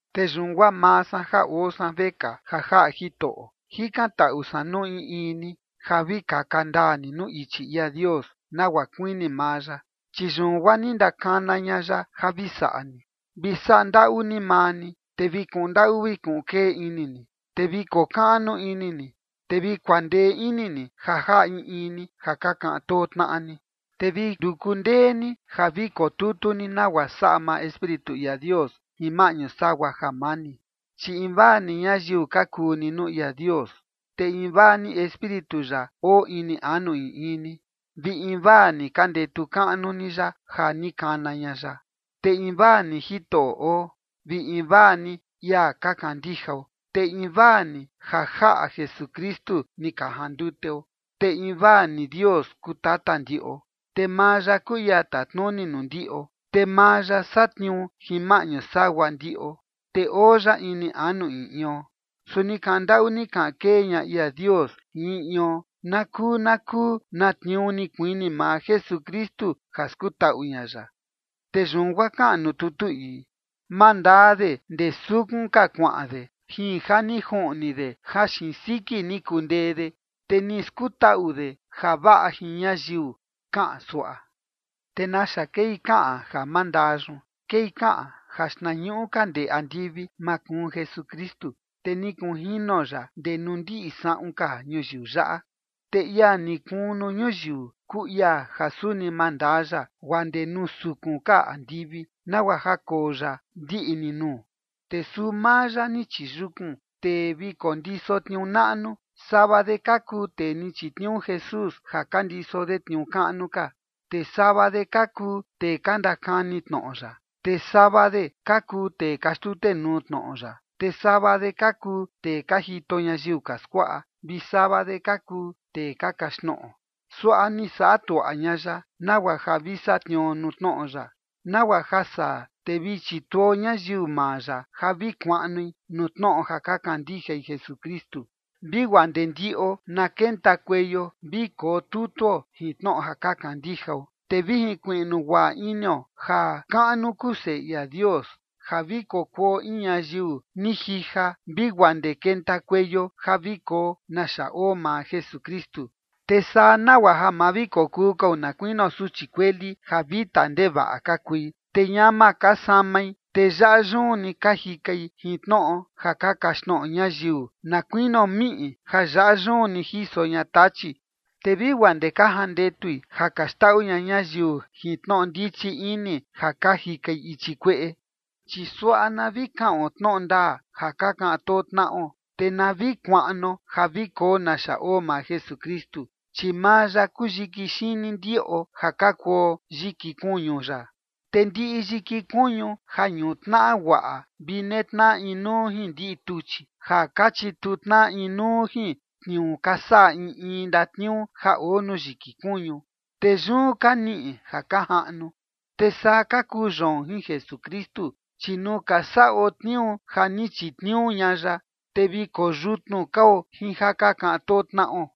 Te yun guaa maa san ja oo san vekaa ja jaꞌa Jitoꞌo, jikantaꞌu san nuu in in ni ja vi kaka ndaa ni nuu ichi ia Dios, nagua kuini maa ya, chi yun guaa ni ndakana ña ya ja vi saꞌa ni. Vi saꞌa ndaꞌu ni maa ni, te vi kuꞌun ndaꞌu vi kuꞌun kee ini ni. Te vi kokaꞌnu ini ni, te vi kuandee ini ni ja jaꞌa in in ni ja ka kaꞌan too tnaꞌa ni, te vi nduku ndee ni ja vi kotutu ni nagua saꞌa maa Espíritu ia Dios jin maꞌñu sagua jamani. Chi invaa ni ñayiu ka kuu ni nuu ia Dios, te invaa ni Espíritu ya oo ini anu in in ni, vi invaa ni ka ndetu kaꞌnu ni ya ja ni kana ña ya, te invaa ni Jitoꞌo oo, vi invaa ni ia ka kandijao, te invaa ni ja jaꞌa Jesukristu ni ka janduteo, te invaa ni Dios kuu Tata ndiꞌo, te maa ya kuu ia tatnuni nuu ndiꞌo, te maa ya satniuu jin maꞌñu sagua ndiꞌo, te oo ya ini anu in ion. Su ni kaꞌan ndaꞌu ni kaꞌan kee ña ia Dios jin in ion na kuu na kuu na tniuu ni kuini maa Jesukristu ja skutaꞌu ña ya. Te yun guaa kaꞌan nuu tutu ii: Mandaa de ndee sukun ka kuaꞌan de, jin ja ni juꞌni de ja xiin siki ni kundee de, te ni skutaꞌu de javaꞌa jin ñayiu, kaꞌan suaꞌa. ¿Te naxa kei kaꞌan ja mandaa yun? Kei kaꞌan ja xtnañuꞌu ka ndee andivi makuun Jesukristu, te ni kunjino ya ndee nuu ndiꞌi saꞌun ka ñuyiu yaꞌa. Te ia ni kuun nuu ñuyiu, kuu ia ja suni mandaa ya guaa ndee nuu sukun ka andivi, nagua ja koo ya ndiꞌi ni nuu. Te suu maa ya ni chiyukun tee vi kondiso tniuu naꞌnu, sava de ka kuu tee ni chitniuu Jesús ja ka ndiso de tniuu kaꞌnu ka, te sava de ka kuu tee ka ndakani tnoꞌo ya, te sava de ka kuu tee ka xtutenuu tnoꞌo ya, te sava de ka kuu tee ka jito ñayiu ka skuaꞌa, vi sava de ka kuu tee ka kaxtnoꞌo. Suaꞌa ni saꞌa tuaꞌa ña ya, nagua ja vi satniuo nuu tnoꞌo ya, nagua ja saa, te vi chituo ñayiu maa ya ja vi kuaꞌnui nuu tnoꞌo ja ka kandijai Jesukristu, vi guaa ndee ndiꞌo na kentakueio vi kotutuo jin tnoꞌo ja ka kandijao, te vi jinkuiꞌnu guaꞌa inio ja kaꞌnu kuu Seꞌe ia Dios, ja vi kokuo in ñayiu ni jija, vi guaa ndee kentakueio ja vi koo naxa oo maa Jesukristu. Te saa nagua ja ma vi kokuu kao na kuinio suchi kueli ja vita ndevaꞌa ka kui, te ñama ka samai, te yaꞌa yun ni ka jikai jin tnoꞌo ja ka kaxtnoꞌo ñayiu na kuinio miꞌi ja yaꞌa yun ni jiso ña tachi, te vi guaa ndee ka jandetui ja ka xndaꞌu ña ñayiu jin tnoꞌo ndichi ini ja ka jikai ichi kueꞌe. Chi suaꞌa na vi kaꞌon tnoꞌo ndaa ja ka kaꞌan too tnaꞌo, te na vi kuaꞌnuo ja vi koo naxa oo maa Jesukristu, chi maa ya kuu yiki xini ndiꞌo ja ka kuo yiki kuñu ya. Te ndiꞌi yiki kuñu ja ñutnaꞌa guaꞌa vi netnaꞌa inuu jin ndiꞌi tuchi, ja ka chitu tnaꞌa inuu jin tniuu ka saꞌa in in ndatniuu ja oo nuu yiki kuñu, te yun ka niꞌi ja ka jaꞌnu. Te saa ka kuu yoon jin Jesukristu, chi nuu ka saꞌo tniuu ja ni chitniuu ña ya, te vi koyutnu kao jin ja ka kaꞌan too tnaꞌo.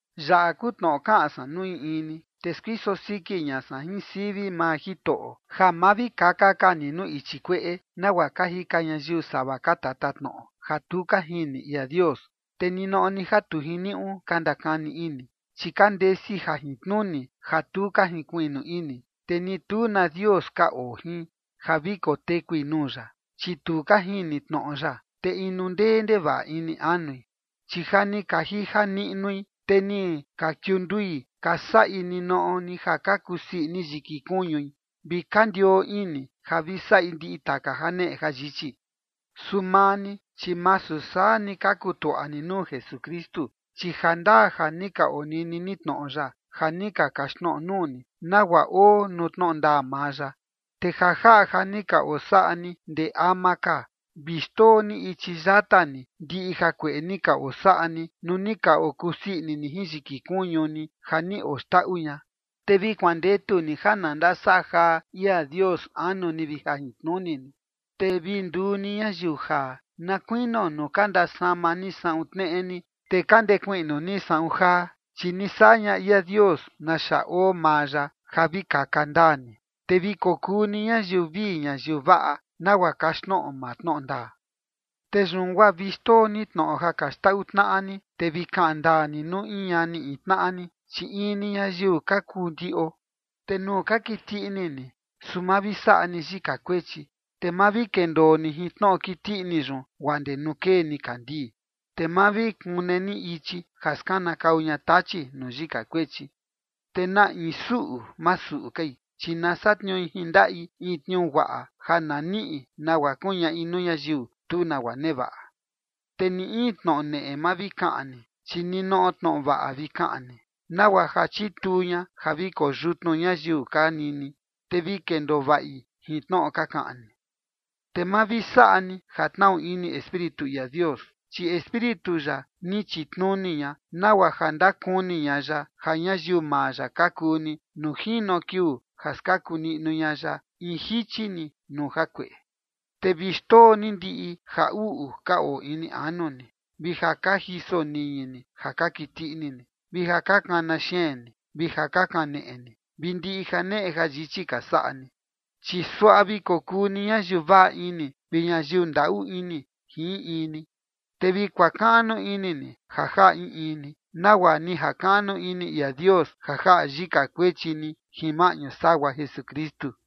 Yaꞌa kuu tnoꞌo kaꞌan san nuu in in ni, te skuiso siki ña san jin sivi maa Jitoꞌo, ja ma vi kaka ka ni nuu ichi kueꞌe, nagua ka jika ñayiu sava ka tatatnoꞌo ja tu ka jini ia Dios, te ninoꞌo ni ja tu jiniuꞌu ka ndakani ini. Chi ka ndesi jajintnuni ja tu ka jinkuiꞌnu ini, te ni tu na Dios ka oo jin ja vi kotekui nuu ya, chi tu ka jini tnoꞌo ya, te inu ndee ndevaꞌa ini anui. Chi ja ni ka jija niꞌnui, te ni ka kiundui ka saꞌi ninoꞌo ni ja ka kusii ini yiki kuñui, vi ka ndioo ini ja vi saꞌi ndiꞌi taka janeꞌe jayichi. Su maa ni, chi masu saa ni ka kutuaꞌa ni nuu Jesukristu. Chi jandaa ja ni ka onini ni tnoꞌo ya, ja ni ka kaxtnoꞌo nuu ni, nagua oo nuu tnoꞌo ndaa maa ya. Te ja jaꞌa ja ni ka osaꞌa ni ndee ama ka, vi xndoo ni ichi yata ni ndiꞌi jakueꞌe ni ka osaꞌa ni nuu ni ka okusii ini ni jin yiki kuñu ni ja ni oxndaꞌu ña, te vi kuandetu ni ja na ndasaꞌa jaa ia Dios anu ni vi jajintnuni ni. Te vi nduu ni ñayiu jaa, na kuinio nuu ka ndasama ni saꞌun tneꞌe ni, te ka ndekuiꞌnu ni saꞌun jaa, chi ni saꞌa ña ia Dios naxa oo maa ya, ja vi kaka ndaa ni, te vi kokuu ni ñayiu vii ñayiu vaꞌa, nagua kaxtnoꞌo maa tnoꞌo ndaa. Te yun guaa vi xndoo ni tnoꞌo ja ka xndaꞌu tnaꞌa ni, te vi kaꞌan ndaa ni nuu in ñani in tnaꞌa ni, chi in ni ñayiu ka kuu ndiꞌo. Te nuu ka kiti ini ni, su ma vi saꞌa ni yika kuechi, te ma vi kendoo ni jin tnoꞌo kiti ini yun guaa ndee nuu kee nikandii, te ma vi kune ni ichi ja skanakau ña Tachi nuu yika kuechi. Te na in suꞌu, ma suꞌu kai, chi na satniui jin ndaꞌi in tniuu guaꞌa ja na niꞌi nagua kuñaꞌi nuu ñayiu tu nagua nevaꞌa. Te ni in tnoꞌo neꞌe ma vi kaꞌan ni, chi ninoꞌo tnoꞌo vaꞌa vi kaꞌan ni, nagua ja chituu ña ja vi koyutnu ñayiu ka nini, te vi kendoo vaꞌi jin tnoꞌo ka kaꞌan ni. Te ma vi saꞌa ni ja tnaꞌu ini Espíritu ia Dios, chi Espíritu ya ni chitnuni ña nagua ja ndakuni ña ya ja ñayiu maa ya ka kuu ni nuu jino kiuu ja skaku niꞌnu ña ya in jichi ni nuu jakueꞌe. Te vi xndoo ni ndiꞌi ja uꞌu ka oo ini anu ni, vi ja ka jiso niñi ni ja ka kiti ini ni, vi ja ka kana xeen ni, vi ja ka kaneꞌe ni, vi ndiꞌi janeꞌe jayichi ka saꞌa ni. Chi suaꞌa vi kokuu ni ñayiu vaꞌa ini vi ñayiu ndaꞌu ini jin in in ni, te vi kuakaꞌnu ini ni ja jaꞌa in in ni, nagua ni jakaꞌnu ini ia Dios ja jaꞌa yika kuechi ni jin maꞌñu sagua Jesukristu.